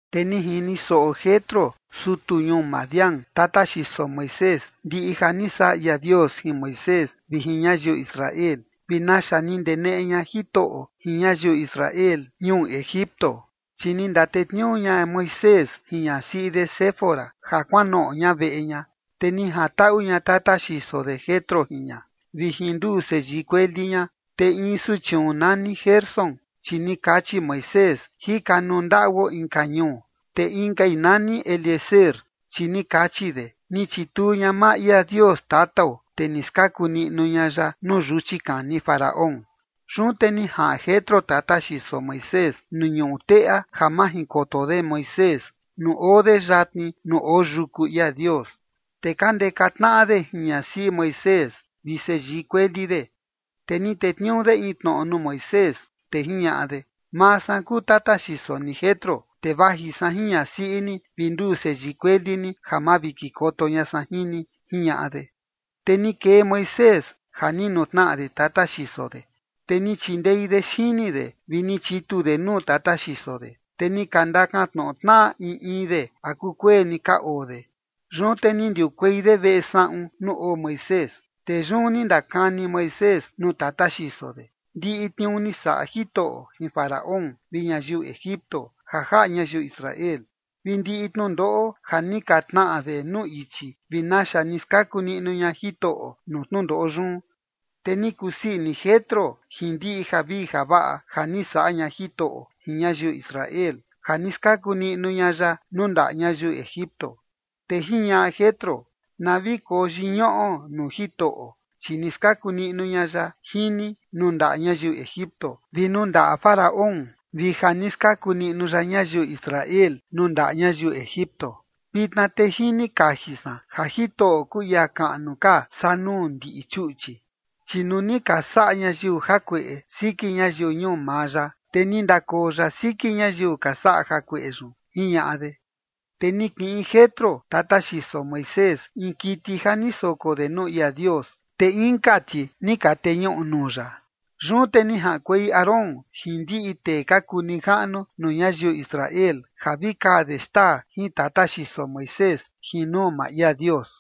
Te ni jini soꞌo Jetro sutu ñuu Madián, tata xiso Moisés, ndiꞌi ja ni saꞌa ia Dios jin Moisés vi jin ñayiu Israel, vi naxa ni ndeneꞌe ña Jitoꞌo jin ñayiu Israel ñuu Egipto. Chi ni ndatetniuu ña Moisés jin ñasiꞌi de Séfora ja kuanoꞌo ña veꞌe ña, te ni jantaꞌu ña tata xiso de Jetro jin ña vi jin nduu seyii kueli ña. Te in suchiun nani Gersón, chi ni kachi Moisés: “Jika nuu ndaꞌuo inka ñuu”. Te inkai nani Eliezer, chi ni kachi de: “Ni chituu ña maa ia Dios tatao, te ni skaku niꞌnu ña ya nuu yuchi kani Faraón”. Yun te ni jaꞌan Jetro, tata xiso Moisés, nuu ñuꞌu teꞌa ja majinkoto de Moisés nuu oo de yatni nuu oo yuku ia Dios. Te ka ndeka tnaꞌa de jin ñasiꞌi Moisés vi seyii kueli de. Te ni tetniuu de in tnoꞌo nuu Moisés, te jiñaꞌa de: ―Maa san kuu tata xiso ni Jetro, te vaji san jin ñasiꞌi ni vi nduu seyii kueli ni ja makikoto ña san jin ni ―jiñaꞌa de. Te ni kee Moisés ja ni nutnaꞌa de tata xiso de, te ni chindei de xini de vi ni chitu de nuu tata xiso de, te ni ka ndakantnoꞌo tnaꞌa in in de a kukueni ka oo de. Yun te ni ndiukuei de veꞌe saꞌun nuu oo Moisés. Te yun ni ndakani Moisés nuu tata xiso de ndiꞌi tniuu ni saꞌa Jitoꞌo jin Faraón vi ñayiu Egipto ja jaꞌa ñayiu Israel, vi ndiꞌi tnundoꞌo ja ni ka tnaꞌa de nuu ichi vi naxa ni skaku niꞌnu ña Jitoꞌo nuu tnundoꞌo yun. Te ni kusii ini Jetro jin ndiꞌi javii javaꞌa ja ni saꞌa ña Jitoꞌo jin ñayiu Israel, ja ni skaku niꞌnu ña ya nuu ndaꞌa ñayiu Egipto. Te jiñaꞌa Jetro: ―Na vi koyiñuꞌo nuu Jitoꞌo, chi ni skaku niꞌnu ña ya jin ni nuu ndaꞌa ñayiu Egipto vi nuu ndaꞌa Faraón, vi ja ni skaku niꞌnu ya ñayiu Israel nuu ndaꞌa ñayiu Egipto. Vitna te jini kaji san ja Jitoꞌo kuu ia kaꞌnu ka saa nuu ndiꞌi chuꞌchi, chi nuu ni ka saꞌa ñayiu jakueꞌe siki ñayiu ñuu maa ya, te ni ndakoo ya siki ñayiu ka saꞌa jakueꞌe yun ―jiñaꞌa de. Te ni kiꞌin Jetro, tata xiso Moisés, in kiti ja ni soko de nuu ia Dios, te inka ti ni ka teñuꞌu nuu ya. Yun te ni jaꞌankuei Aarón jin ndiꞌi tee ka kuu nijaꞌnu nuu ñayiu Israel ja vi kaa de xtaa jin tata xiso Moisés jin nuu maa ia Dios.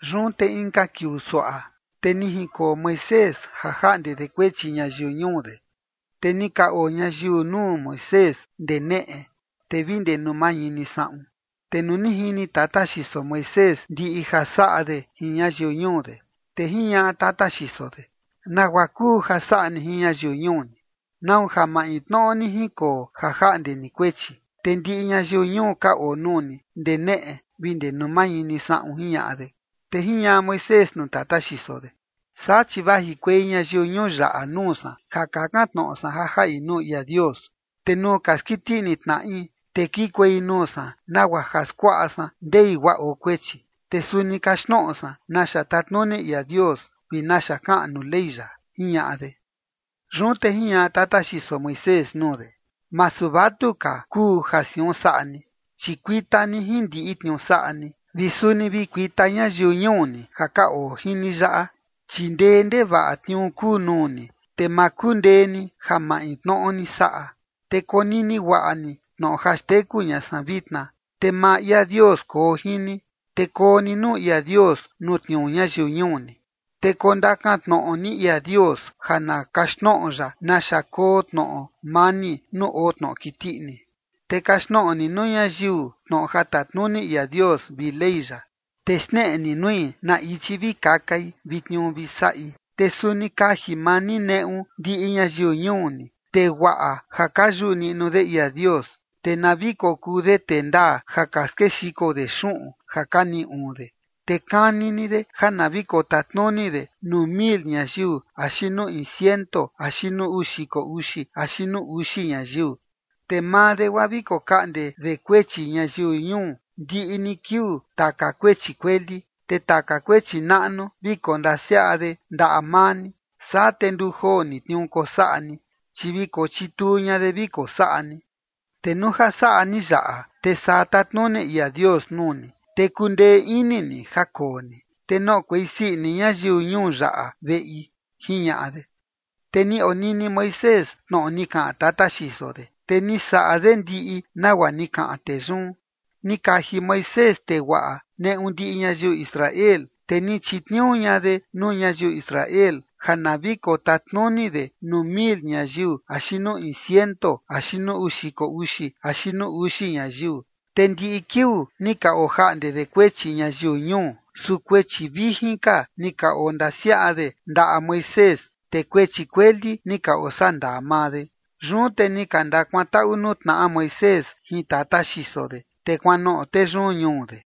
Yun te inka kiuu suaꞌa, te ni jinkoo Moisés ja jaꞌnde de kuechi ñayiu ñuu de, te ni ka oo ñayiu nuu Moisés ndee neꞌe, te vi ndee nuu mañini saꞌun. Te nuu ni jini tata xiso Moisés ndiꞌi ja saꞌa de jin ñayiu ñuu de, te jiñaꞌa tata xiso de: ―¿Nagua kuu ja saꞌa ni jin ñayiu ñuu ni? ¿Nau ja maintnoꞌo ni jinkoo ja jaꞌnde ni kuechi, te ndiꞌi ñayiu ñuu ka oo nuu ni ndee neꞌe vi ndee nuu mañini saꞌun? ―jiñaꞌa de. Te jiñaꞌa Moisés nuu tata xiso de: ―Saa chi vajikuei ñayiu ñuu yaꞌa nuu san ja kakan tnoꞌo san ja jaꞌi nuu ia Dios. Te nuu ka skiti ini tnaꞌi, te kikuei nuu san, nagua ja skuaꞌa san ndei guaa oo kuechi. Te suni kaxtnoꞌo san naxa tatnuni ia Dios vi naxa kaꞌan nuu Ley ya ―jiñaꞌa de. Yun te jiñaꞌa tata xiso Moisés nuu de: ―Masu vatuka kuu ja siun saꞌa ni. Chi kuita ni jin ndiꞌi tniuu saꞌa ni, vi suni vi kuita ñayiu ñuu ni ja ka oo jin ni yaꞌa, chi ndee ndevaꞌa tniuu kuu nuu ni, te ma kundee ni ja maintnoꞌo ni saꞌa. Te konini guaꞌa ni tnoꞌo ja xteku ña san vitna, te maa ia Dios koo jin ni, te koo ni nuu ia Dios nuu tniuu ñayiu ñuu ni, te kondakan tnoꞌo ni ia Dios ja na kaxtnoꞌo ya naxa koo tnoꞌo mani nuu oo tnoꞌo kiti ini. Te kaxtnoꞌo ni nuu ñayiu tnoꞌo ja tatnuni ia Dios vi Ley ya, te xneꞌe ni nui na ichi vi kakai vi tniuu vi saꞌi. Te suni kaji maa ni neꞌu ndiꞌi ñayiu ñuu ni, tee guaꞌa ja ka yuꞌu niꞌnu de ia Dios, te na vi kokuu de tee ndaa ja ka skexiko de xuꞌun ja ka niꞌi uun de. Te kani ni de ja na vi kotatnuni de nuu mil ñayiu axi nuu in ciento axi nuu uu xiko uxi axi nuu uxi ñayiu. Te maa de, guaa vi kokaꞌnde de kuechi ñayiu ñuu ndiꞌi ni kiuu taka kuechi kueli, te taka kuechi naꞌnu vi kondasiaꞌa de ndaꞌa maa ni. Saa te nduu joo ni tniuu kosaꞌa ni, chi vi kochituu ña de vi kosaꞌa ni. Te nuu ja saꞌa ni yaꞌa, te saa tatnuni ia Dios nuu ni, te kundee ini ni ja koo ni, te noꞌokuei sii ini ñayiu ñuu yaꞌa veꞌi ―jiñaꞌa de. Te ni onini Moisés tnoꞌo ni kaꞌan tata xiso de, te ni saꞌa de ndiꞌi nagua ni kaꞌan tee yun. Ni kaji Moisés tee guaꞌa neꞌu ndiꞌi ñayiu Israel, te ni chitniuu ña de nuu ñayiu Israel ja na vi kotatnuni de nuu mil ñayiu axi nuu in ciento axi nuu uu xiko uxi axi nuu uxi ñayiu. Te ndiꞌi kiuu ni ka ojaꞌnde de kuechi ñayiu ñuu, su kuechi vijin ka ni ka ondasiaꞌa de ndaꞌa Moisés, te kuechi kueli ni ka osandaa maa de. Yun te ni ka ndakuantaꞌu nuu tnaꞌa Moisés jin tata xiso de, te kuanoꞌo tee yun ñuu de.